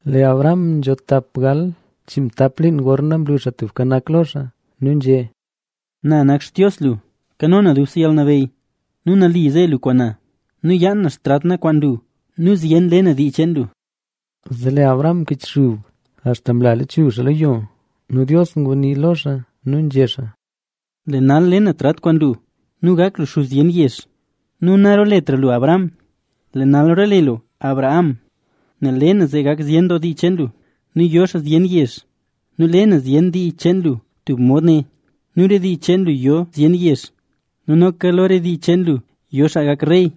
Lee Abram nzho tap gal chiinmtap liin gorna mlu Xaa Tubka Nak lo xaa nu nzhé xaa: —Na nak Xtios lu xaa nzhak ndil. Nu nali ze lu kwaan na. Nu yaan na xtrat na kwaan lu. Nu zyen doo le na re dii cheen lu. Zee lee Abram mkichxub nu axta mla lechuzh xaa lo yo nu ngunii Dios lo xaa nu nzhé xaa: —Lee nal le na tub trat kwaan lu nu gak lu xuz zyen doo yezh. Nu narooletra lu Abram, lee nal roole lu Abraham;a nel le na zee gak zyen doo dii cheen lu nu yo xaa zyen yezh. Nu le na zyen doo dii cheen lu. Nu lo re dii cheen lu roo zyen doo yezh nu noka lo re dii cheen lu yo xaa gak rey.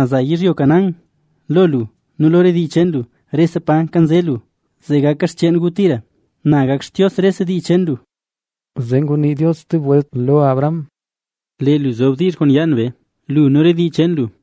Za na yizhyo Canaán lo lu nu lo re dii cheen lu, paro nzho lu, rese pa mkanze lu, zee gaka xcheen gu tira. Na gak Xtios rese dii cheen lu. Zee ngunii Dios stub welt lo Abraham: —Lee lu zob diizh kwaan myaan na kwaan lu, lu nu re dii cheen lu.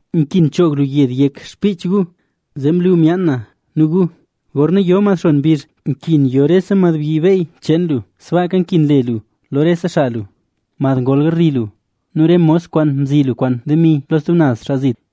Nkin choog lu tik yed cho gu, zee mlu myaan na kwaan gu. Gorna yo mad xon mbizh, nkin yo rese madbyi beey cheen lu, sbaaka nkin le lu lo rese xaa lu, mad ngol garli lu nu re mos kwaan mzi lu kwaan demi lo stub naz xaa zit.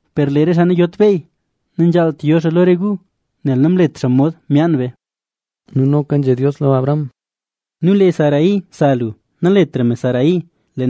Per lee re xaa nayot beey, nanzhaalt yo xaa lo re gu, nel namlet xaa mod myaan be. Nu noka nzhé Dios lo Abraham: —Nu lee Sarai, sa lu, naletra me Sarai,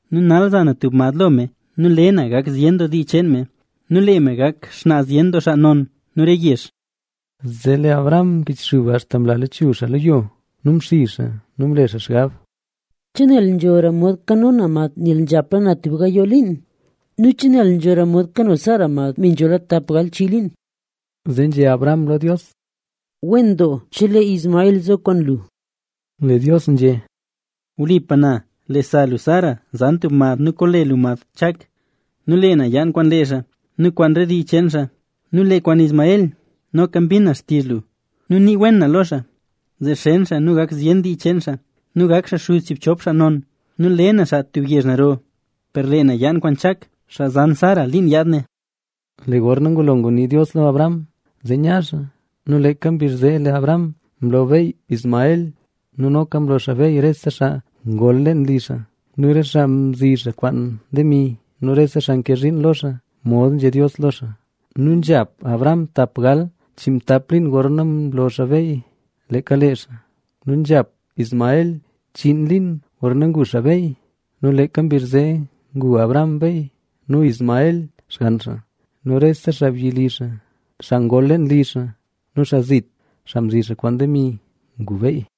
Nu nal za na tub mad lo me nu le na gak zyen doo dii cheen me nu lee me gak xnaa zyen xaa non nu re yezh. Zee lee Abraham mkichxub axta mla lachuzh xaa lo yo. Nu mxizh xaa nu mle xaa xgab: “¿Che nel nzhora mod kano na mad nel nzhola na tub gayoo liin? ¿Nu che nel nzhora mod kano Sara mad, me nzhola tap gal chii liin?” Zee nzhé Abraham lo Dios: —Wen doo chelee Ismael zo kwaan lu. Lee Dios nzhé: —Wlipa na, lee sa lu Sara zan tub mad nu koole lu mad Chak.c Nu lee na yaan kwaan lee xaa nu kwaan re dii cheen xaa. Nu lee kwaan Ismael, noka mbin na xtizh lu nu nii na wen lo xaa, zee xen xaa nu gak zyen dii cheen xaa. Nu gak xaa xuz chiibchop xaa non nu le na xaa tub yezh naro. Per lee na yaan kwaan Chak, xaa zan Sara liin yaad ne. Lee gorna ngulo ngunii Dios lo Abraham, zee nya xaa. Nu leeka mbizh zee lee Abraham mlo beey Ismael; nu noka mlo xaa beey rese xaa ngol leen li xaa nu re xaa mzi xaa kwaan demi nu rese xaa nke zhiin lo xaa, mod nzhé Dios lo xaa. Nu nzhap Abraham tap gal chiinmtap liin gorna mlo xaa beey leeka lee xaa. Nu nzhap Ismael chiin liin gorna ngu xaa beey. Nu leeka mbizh zee ngu Abraham beey nu Ismael, nu rese xaabyi li xaa, xaa ngol leen li xaa nu xaa zit, xaa mzi xaa kwaan demi, ngu beey.